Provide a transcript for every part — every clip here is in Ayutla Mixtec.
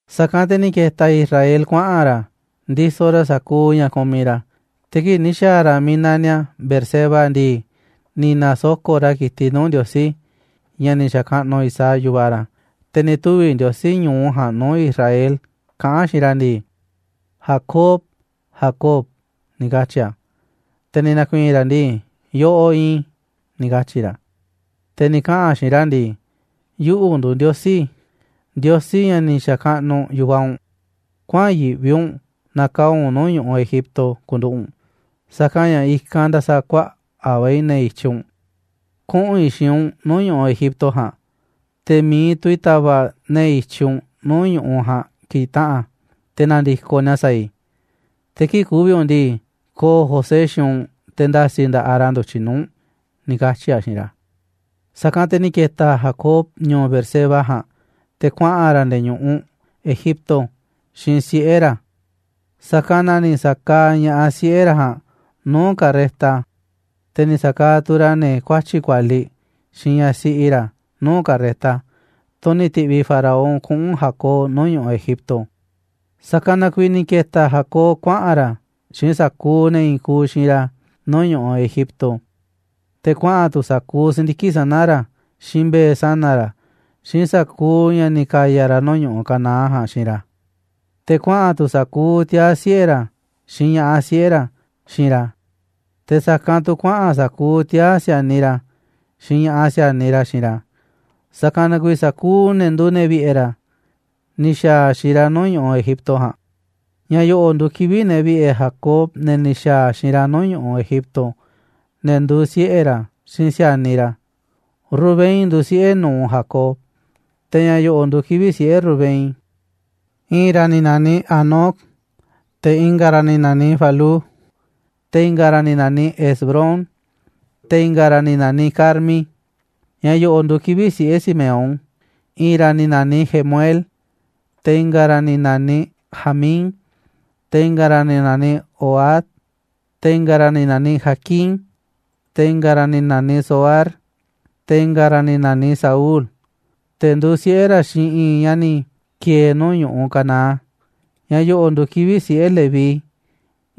Sa̱kanꞌ te̱ ni̱ ke̱ta̱ Israel kuaꞌa̱n ra̱ ndisoꞌ ra̱ sa̱kuuꞌ ña̱ kumiꞌ ra̱, te̱ kii̱ꞌ ni̱ xa̱a̱ ra̱ miiꞌ naniꞌ a̱ Beerseba ndii, ni̱ na̱soko̱ꞌ ra̱ ki̱tiꞌ nuu̱ꞌ Ndiosí, ña̱ ni̱ xa̱kaꞌnuꞌ Isaac, yu̱vaꞌ ra̱. Te̱ ni̱ tuvi̱ Ndiosí ñu̱u ja̱a̱nꞌ nuu̱ꞌ Israel kaꞌán a̱ xiinꞌ ra̱ ndii: ―Jacob, Jacob ―ni̱ katyi̱ a̱. Te̱ ni̱ na̱ku̱i̱i̱n ra̱ ndii: ―Yoꞌoꞌ iinꞌ i̱ ―ni̱ katyi̱ ra̱. Te̱ ni̱ kaꞌa̱n a̱ xiinꞌ ra̱ ndii: ―Yuꞌu̱ nduuꞌ Ndiosí, Ndiosí ña̱ ni̱ xa̱kaꞌnuꞌ yu̱vaꞌ u̱nꞌ. Kuäa̱n yiꞌvi u̱nꞌ na̱kaa̱ꞌ u̱nꞌ nuu̱ꞌ ñu̱ꞌuꞌ Egipto ku̱nduꞌu̱ꞌ u̱nꞌ, sa̱kanꞌ ña̱ i̱kanꞌ nda̱sa̱kuaꞌa̱ꞌ va̱ i̱ ne̱ i̱tyiꞌ u̱nꞌ. Kuꞌu̱n i̱ xiinꞌ u̱nꞌ nuu̱ꞌ ñu̱ꞌuꞌ Egipto ja̱a̱nꞌ, te̱ mi̱iꞌ tu̱ i̱ ta̱va̱ꞌ ne̱ i̱tyiꞌ u̱nꞌ nuu̱ꞌ ñu̱ꞌuꞌ ja̱a̱nꞌ ki̱taꞌa̱n te̱ na̱ndi̱koꞌ ni̱a̱ sa̱a̱ i̱. Te̱ kii̱ꞌ ku̱vi̱ u̱nꞌ ndii, ko̱o̱ José xiinꞌ u̱nꞌ, te̱ nda̱si̱ nda̱ꞌaꞌ ra̱ ndu̱tyiꞌ nuu̱ꞌ u̱nꞌ ―ni̱ katyi̱ a̱ xiinꞌ ra̱. Sa̱kanꞌ te̱ ni̱ ke̱ta̱ Jacob ñu̱u̱ Beerseba ja̱a̱nꞌ, te̱ kuaꞌa̱n ra̱ nde̱e̱ ñu̱ꞌuꞌ Egipto xiinꞌ siꞌe̱ ra̱. Sa̱kanꞌ na ni̱ sa̱kaaꞌ ña̱ꞌaꞌ siꞌe̱ ra̱ ja̱a̱nꞌ nuu̱ꞌ carreta, te̱ ni̱ sa̱kaaꞌ tu̱ ra̱ ne̱ kuatyi̱ꞌ kualiꞌ, xiinꞌ ñaꞌ siꞌi ra̱ nuu̱ꞌ carreta, tunꞌ ni̱ ti̱ꞌviꞌ Faraón kuꞌu̱n Jacob nuu̱ꞌ ñu̱ꞌuꞌ Egipto. Sa̱kanꞌ na kuiiꞌ ni̱ ke̱ta̱ Jacob kuaꞌa̱n ra̱ xiinꞌ sa̱kuuꞌ ne̱ i̱i̱n kuuꞌ xiinꞌ ra̱ nuu̱ꞌ ñu̱ꞌuꞌ Egipto, te̱ kuaꞌa̱n tu̱ sa̱kuuꞌ si̱ndiki̱ꞌ sana̱ ra̱, xiinꞌ mbe̱e̱ sana̱ ra̱, xiinꞌ sa̱kuuꞌ ña̱ ni̱ ka̱ya̱ ra̱ nuu̱ꞌ ñu̱ꞌuꞌ Canaán ja̱a̱nꞌ xiinꞌ ra̱. Te̱ kuaꞌa̱n tu̱ sa̱kuuꞌ tiaa̱ siꞌe̱ ra̱, xiinꞌ ña̱ꞌaꞌ siꞌe̱ ra̱ xiinꞌ ra̱, te̱ sa̱kanꞌ tu̱ kuaꞌa̱n sa̱kuuꞌ tiaa̱ si̱a̱niꞌ ra̱ xiinꞌ ña̱ꞌaꞌ si̱a̱niꞌ ra̱ xiinꞌ ra̱. Sa̱kanꞌ na kuiiꞌ sa̱kuuꞌ ne̱ nduuꞌ ne̱ vi̱ꞌe̱ ra̱ ni̱ xa̱a̱ xiinꞌ ra̱ nuu̱ꞌ ñu̱ꞌuꞌ Egipto ja̱a̱nꞌ. Ña̱ yo̱ꞌo̱ nduuꞌ kivi̱ꞌ ne̱ vi̱ꞌe̱ Jacob, ne̱ ni̱ xa̱a̱ xiinꞌ ra̱ nuu̱ꞌ ñu̱ꞌuꞌ Egipto, ne̱ nduuꞌ siꞌe̱ ra̱ xiinꞌ si̱a̱niꞌ ra̱: Rubén nduuꞌ siꞌe̱ nu̱uꞌ Jacob. Te̱ ña̱ yo̱ꞌo̱ nduuꞌ kivi̱ꞌ siꞌe̱ Rubén: I̱i̱n ra̱ ni̱ na̱niꞌ Hanoc, te̱ i̱nga̱ ra̱ ni̱ na̱niꞌ Falú, te̱ i̱nga̱ ra̱ ni̱ na̱niꞌ Hezrón, te̱ i̱nga̱ ra̱ ni̱ na̱niꞌ Carmi. Ña̱ yo̱ꞌo̱ nduuꞌ kivi̱ꞌ siꞌe̱ Simeón: I̱i̱n ra̱ ni̱ na̱niꞌ Jemuel, te̱ i̱nga̱ ra̱ ni̱ na̱niꞌ Jamín, te̱ i̱nga̱ ra̱ ni̱ na̱niꞌ Ohad, te̱ i̱nga̱ ra̱ ni̱ na̱niꞌ Jaquín, te̱ i̱nga̱ ra̱ ni̱ na̱niꞌ Zohar, te̱ i̱nga̱ ra̱ ni̱ na̱niꞌ Saúl, te̱ nduuꞌ siꞌe̱ ra̱ xiinꞌ i̱i̱n ñaꞌ ni̱ ki̱e̱e̱ nuu̱ꞌ ñu̱ꞌuꞌ Canaán. Ña̱ yo̱ꞌo̱ nduuꞌ kivi̱ꞌ siꞌe̱ Leví: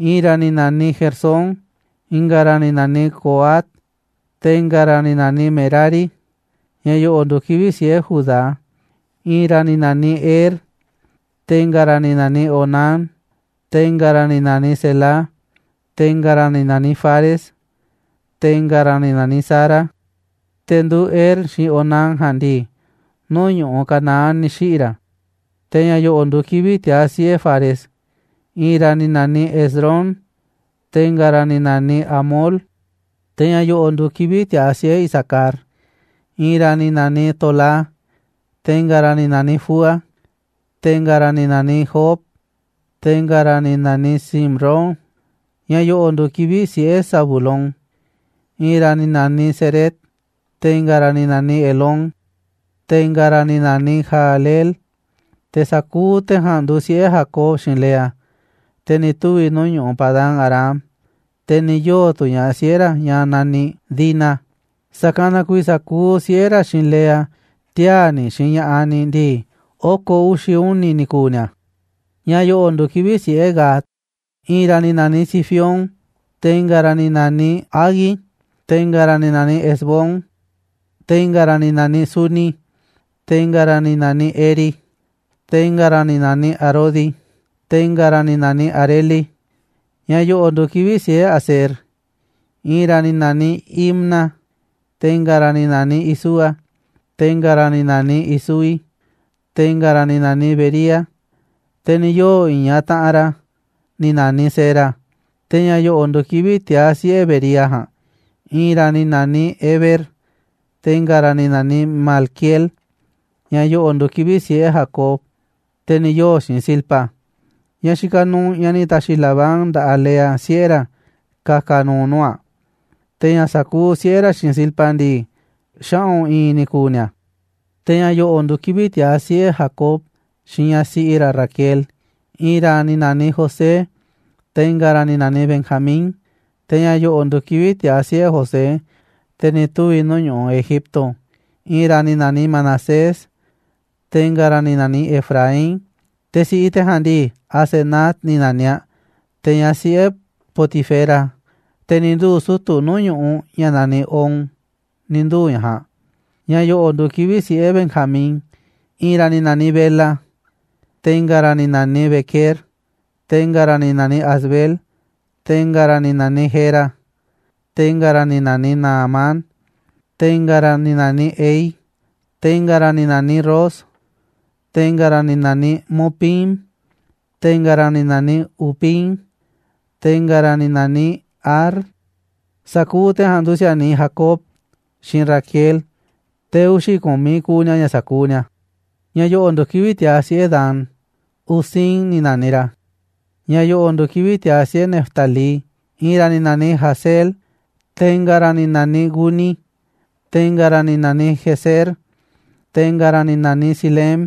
I̱i̱n ra̱ ni̱ naniꞌ Gersón, i̱nga̱ ra̱ ni̱ na̱niꞌ Coat, te̱ i̱nga̱ ra̱ ni̱ na̱niꞌ Merari. Ña̱ yo̱ꞌo̱ nduuꞌ kivi̱ꞌ siꞌe̱ Judá: I̱i̱n ra̱ ni̱ na̱niꞌ Er, te̱ i̱nga̱ ra̱ ni̱ na̱niꞌ Onán, te̱ i̱nga̱ ra̱ ni̱ na̱niꞌ Selá, te̱ i̱nga̱ ra̱ ni̱ na̱niꞌ Fares, te̱ i̱nga̱ ra̱ ni̱ na̱niꞌ Zara. Te̱ nduuꞌ Er xiinꞌ Onán ja̱a̱nꞌ ndii, nuu̱ꞌ ñu̱ꞌuꞌ Canaán ni̱ xiꞌi̱ ra̱. Te̱ ña̱ yo̱ꞌo̱ nduuꞌ kivi̱ꞌ tiaa̱ siꞌe̱ Fares: I̱i̱n ra̱ ni̱ na̱niꞌ Hezrón, te̱ i̱nga̱ ra̱ ni̱ na̱niꞌ Hamul. Te̱ ña̱ yo̱ꞌo̱ nduuꞌ kivi̱ꞌ tiaa̱ siꞌe̱ Isacar: I̱i̱n ra̱ ni̱ na̱niꞌ Tolá, te̱ i̱nga̱ ra̱ ni̱ na̱niꞌ Fúa, te̱ i̱nga̱ ra̱ ni̱ naniꞌ Job, te̱ i̱nga̱ ra̱ ni̱ na̱niꞌ Simrón. Ña̱ yo̱ꞌo̱ nduuꞌ kivi̱ꞌ siꞌe̱ Zabulón: I̱i̱n ra̱ ni̱ na̱niꞌ Sered, te̱ i̱nga̱ ra̱ ni̱ na̱niꞌ Elón, te̱ i̱nga̱ ra̱ ni̱ na̱niꞌ Jahleel. Te̱ sa̱kuuꞌ te̱ ja̱a̱nꞌ nduuꞌ siꞌe̱ Jacob xiinꞌ Lea, te̱ ni̱ tuvi̱ nuu̱ꞌ ñu̱ꞌuꞌ Padán-arám, te̱ ni̱ yoo̱ tu̱ ña̱ꞌaꞌ siꞌe̱ ra̱, ñaꞌ na̱niꞌ Dina. Sa̱kanꞌ na kuiiꞌ ña̱ sa̱kuuꞌ siꞌe̱ ra̱ xiinꞌ Lea, tiaa̱ ni̱ xiinꞌ ña̱ꞌaꞌ ni̱ ndii, oko̱ uxi̱ uni̱ ni̱ ku̱u̱ ni̱a̱. Ña̱ yo̱ꞌo̱ nduuꞌ kivi̱ꞌ siꞌe̱ Gad: I̱i̱n ra̱ ni̱ na̱niꞌ Zifión, te̱ i̱nga̱ ra̱ ni̱ na̱niꞌ Hagui, te̱ i̱nga̱ ra̱ ni̱ na̱niꞌ Ezbón, te̱ i̱nga̱ ra̱ ni̱ na̱niꞌ Suni, te̱ i̱nga̱ ra̱ ni̱ na̱niꞌ Eri, te̱ i̱nga̱ ni̱ na̱niꞌ Arodi, te̱ i̱nga̱ ra̱ ni̱ na̱niꞌ Areli. Ña̱ yo̱ꞌo̱ nduuꞌ kivi̱ꞌ siꞌe̱ Aser: I̱i̱n ra̱ ni̱ na̱niꞌ Imna, te̱ i̱nga̱ ra̱ ni̱ na̱niꞌ Isúa, te̱ i̱nga̱ ra̱ ni̱ na̱niꞌ Isúi, te̱ i̱nga̱ ni̱ na̱niꞌ Bería, te̱ ni̱ yoo̱ i̱i̱n ñaꞌ taꞌanꞌ ra̱ ni̱ na̱niꞌ Sera. Te̱ ña̱ yo̱ꞌo̱ nduuꞌ kivi̱ꞌ tiaa̱ siꞌe̱ Bería ja̱a̱nꞌ: I̱i̱n ra̱ ni̱ na̱niꞌ Heber, te̱ i̱nga̱ ni̱ na̱niꞌ Malquiel. Ña̱ yo̱ꞌo̱ nduuꞌ kivi̱ꞌ siꞌe̱ Jacob, te̱ ni̱ yoo̱ xiinꞌ Zilpa, ñaꞌ xikaꞌ nuuꞌ ñaꞌ ni̱ ta̱xi̱ Labán nda̱ꞌaꞌ Lea, siꞌe̱ ra̱, ka̱ka̱ nu̱u̱ nuu̱ꞌ aꞌ. Te̱ ña̱ sa̱kuuꞌ siꞌe̱ ra̱ xiinꞌ Zilpa ndii, xaꞌu̱n i̱i̱n ni̱ ku̱u̱ ni̱a̱. Te̱ ña̱ yo̱ꞌo̱ nduuꞌ kivi̱ꞌ tiaa̱ siꞌe̱ Jacob xiinꞌ ñaꞌ siꞌi ra̱ Raquel: I̱i̱n ra̱ ni̱ na̱niꞌ José, te̱ i̱nga̱ ra̱ ni̱ na̱niꞌ Benjamín. Te̱ ña̱ yo̱ꞌo̱ nduuꞌ kivi̱ꞌ tiaa̱ siꞌe̱ José, te̱ ni̱ tuvi̱ nuu̱ꞌ ñu̱ꞌuꞌ Egipto: I̱i̱n ra̱ ni̱ na̱niꞌ Manasés, te̱ i̱nga̱ ra̱ ni̱ na̱niꞌ Efraín. Te̱ si̱ꞌiꞌ te̱ ja̱a̱nꞌ ndii, Asenat ni̱ na̱niꞌ aꞌ, te̱ ñaꞌ siꞌe̱ Potifera, te̱ ni̱ nduu̱ sutu̱ nuu̱ꞌ ñu̱ꞌuꞌ ña̱ naniꞌ On, ni̱ nduu̱ ñaꞌ ja̱a̱nꞌ. Ña̱ yo̱ꞌo̱ nduuꞌ kivi̱ꞌ siꞌe̱ Benjamín: I̱i̱n ra̱ ni̱ na̱niꞌ Bela, te̱ i̱nga̱ ra̱ ni̱ na̱niꞌ Bequer, te̱ i̱nga̱ ra̱ ni̱ na̱niꞌ Asbel, te̱ i̱nga̱ ra̱ ni̱ na̱niꞌ Gera, te̱ i̱nga̱ ra̱ ni̱ na̱niꞌ Naamán, te̱ i̱nga̱ ra̱ ni̱ na̱niꞌ Ehi, te̱ i̱nga̱ ra̱ ni̱ na̱niꞌ Ros, te̱ i̱nga̱ ra̱ ni̱ na̱niꞌ Mupim, te̱ i̱nga̱ ra̱ ni̱ na̱niꞌ Hupim, te̱ i̱nga̱ ra̱ ni̱ na̱niꞌ Ard. Sa̱kuuꞌ te̱ ja̱a̱nꞌ nduuꞌ si̱a̱niꞌ Jacob xiinꞌ Raquel, te̱ uxi̱ ku̱miꞌ kuuꞌ ni̱a̱ ña̱ sa̱kuuꞌ ni̱a̱. Ña̱ yo̱ꞌo̱ nduuꞌ kivi̱ꞌ tiaa̱ siꞌe̱ Dan: Husim ni̱ na̱niꞌ ra̱. Ña̱ yo̱ꞌo̱ nduuꞌ kivi̱ꞌ tiaa̱ siꞌe̱ Neftalí: I̱i̱n ra̱ ni̱ na̱niꞌ Jahzeel, te̱ i̱nga̱ ra̱ ni̱ na̱niꞌ Guni, te̱ i̱nga̱ ra̱ ni̱ na̱niꞌ Jezer, te̱ i̱nga̱ ra̱ ni̱ na̱niꞌ Silem.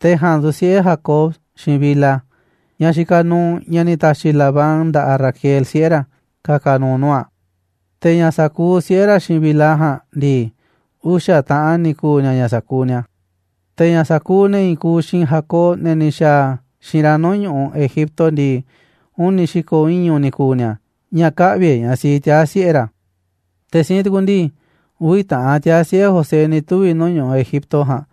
Te̱ ja̱a̱nꞌ nduuꞌ siꞌe̱ Jacob xiinꞌ Bilha, ñaꞌ xikaꞌ nuuꞌ ñaꞌ ni̱ ta̱xi̱ Labán nda̱ꞌaꞌ Raquel, siꞌe̱ ra̱, ka̱ka̱ nu̱u̱ nuu̱ꞌ aꞌ. Te̱ ña̱ sa̱kuuꞌ siꞌe̱ ra̱ xiinꞌ Bilha ja̱a̱nꞌ ndii, uxa̱ taꞌan ni̱ ku̱u̱ ni̱a̱ ña̱ sa̱kuuꞌ ni̱a̱. Te̱ ña̱ sa̱kuuꞌ ne̱ i̱i̱n kuuꞌ xiinꞌ Jacob, ne̱ ni̱ xa̱a̱ xiinꞌ ra̱ nuu̱ꞌ ñu̱ꞌuꞌ Egipto ndii, uni̱ xi̱ko̱ iñu̱ ni̱ ku̱u̱ ni̱a̱, ña̱ kä̱ꞌvi̱ e̱ꞌ ñaꞌ siꞌi tiaa̱ siꞌe̱ ra̱. Te̱ siinꞌ tukuꞌ ndii, uvi̱ taꞌan tiaa̱ siꞌe̱ José ni̱ tuvi̱ nuu̱ꞌ ñu̱ꞌuꞌ Egipto ja̱a̱nꞌ,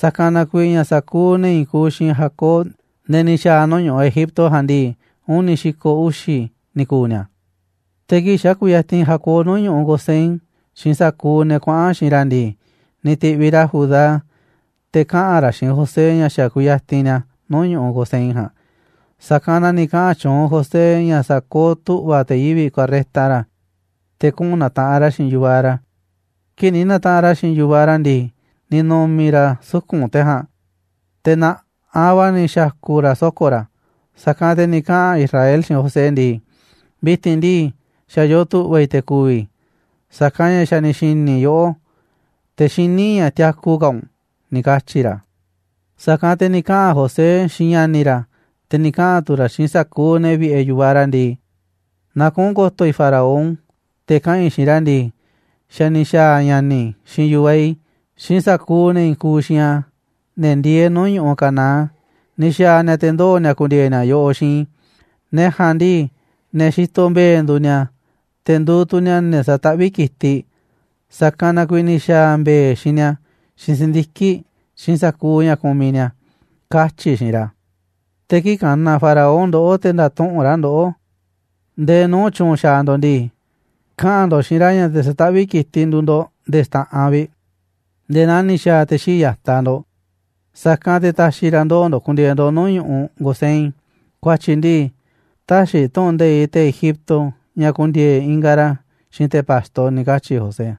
sa̱kanꞌ na kuiiꞌ ña̱ sa̱kuuꞌ ne̱ i̱i̱n kuuꞌ xiinꞌ Jacob, ne̱ ni̱ xa̱a̱ nuu̱ꞌ ñu̱ꞌuꞌ Egipto ja̱a̱nꞌ ndii, uni̱ xi̱ko̱ uxi̱ ni̱ ku̱u̱ ni̱a̱ Te̱ kii̱ꞌ xa̱ kuyatinꞌ Jacob nuu̱ꞌ ñu̱ꞌuꞌ Gosén xiinꞌ sa̱kuuꞌ ne̱ kuaꞌa̱n xiinꞌ ra̱ ndii, ni̱ ti̱ꞌviꞌ ra̱ Judá, te̱ kaꞌa̱n ra̱ xiinꞌ José ña̱ xa̱ kuyatinꞌ ni̱a̱ nuu̱ꞌ ñu̱ꞌuꞌ Gosén ja̱a̱nꞌ. Sa̱kanꞌ na ni̱ kaꞌa̱n tyuunꞌ José ña̱ sa̱kooꞌ tu̱ꞌva̱ te̱ yivi̱ꞌ carreta ra̱, te̱ kuꞌu̱n na̱taꞌanꞌ ra̱ xiinꞌ yu̱vaꞌ ra̱. Kii̱ꞌ ni̱ na̱taꞌanꞌ ra̱ xiinꞌ yu̱vaꞌ ra̱ ndii, ni̱ nu̱mi̱ ra̱ suku̱nꞌ te̱ ja̱a̱nꞌ, te̱ na̱ꞌaꞌ va̱ ni̱ xa̱ku̱ ra̱ soko̱ ra̱. Sa̱kanꞌ te̱ ni̱ kaꞌa̱n Israel xiinꞌ José ndii: ―Vi̱ti̱n ndii, xa̱ yoo tu̱ꞌva̱ i̱ te̱ ku̱vi̱ i̱, sa̱kanꞌ ña̱ xa̱ ni̱ xi̱ni̱ i̱ yoꞌó, te̱ xiní i̱ ña̱ tiaku ka̱ u̱nꞌ ―ni̱ katyi̱ ra̱. Sa̱kanꞌ te̱ ni̱ kaꞌa̱n José xiinꞌ ña̱ni̱ ra̱, te̱ ni̱ kaꞌa̱n tu̱ ra̱ xiinꞌ sa̱kuuꞌ ne̱ vi̱ꞌe̱ yu̱vaꞌ ra̱ ndii: ―Na kuꞌu̱n ko̱to̱ i̱ Faraón, te̱ kaꞌa̱n i̱ xiinꞌ ra̱ ndii: “Xa̱ ni̱ xa̱a̱ ña̱ni̱ i̱ xiinꞌ yu̱vaꞌ i̱, xiinꞌ sa̱kuuꞌ ne̱ i̱i̱n kuuꞌ xiinꞌ a̱, ne̱ ndieeꞌ nuu̱ꞌ ñu̱ꞌuꞌ Canaán, ni̱ xa̱a̱ ni̱a̱ te̱ ndoo̱ ni̱a̱ ku̱ndi̱e̱e̱ ni̱a̱ yoꞌoꞌ xiinꞌ i̱. Ne̱ ja̱a̱nꞌ ndii, ne̱ xitoꞌ mbe̱e̱ nduuꞌ ni̱a̱, te̱ nduuꞌ tu̱ ni̱a̱ ne̱ sataꞌvíꞌ ki̱tiꞌ, sa̱kanꞌ na kuiiꞌ ni̱ xa̱a̱ mbe̱e̱ xiinꞌ ni̱a̱, xiinꞌ si̱ndiki̱ꞌ, xiinꞌ sa̱kuuꞌ ña̱ kumiꞌ ni̱a̱”, katyi̱ i̱ xiinꞌ ra̱. Te̱ kii̱ꞌ ka̱na̱ Faraón ndoꞌó, te̱ nda̱tuꞌu̱nꞌ ra̱ ndoꞌó ndee nuu̱ꞌ tyu̱u̱n xaaꞌ ndo̱ꞌ ndii, kaꞌa̱n ndo̱ꞌ xiinꞌ ra̱ ña̱ te̱ sataꞌvíꞌ ki̱tiꞌ nduuꞌ ndo̱ꞌ nde̱e̱ xta̱ꞌanꞌ vi̱ꞌ, nde̱e̱ naa ni̱ xa̱a̱ te̱ xii̱ꞌ ya̱taꞌ ndo̱ꞌ. Sa̱kanꞌ te̱ ta̱xi̱ ra̱ ndoo̱ ndo̱ꞌ ku̱ndi̱e̱e̱ ndo̱ꞌ nuu̱ꞌ ñu̱ꞌuꞌ Gosén, ku̱a̱tyi̱ ndii, täxiꞌ tu̱ꞌu̱n nde̱iꞌ te̱ Egipto ña̱ ku̱ndi̱e̱e̱ ingaꞌ ra̱ xiinꞌ te̱ pa̱xto ―ni̱ katyi̱ José.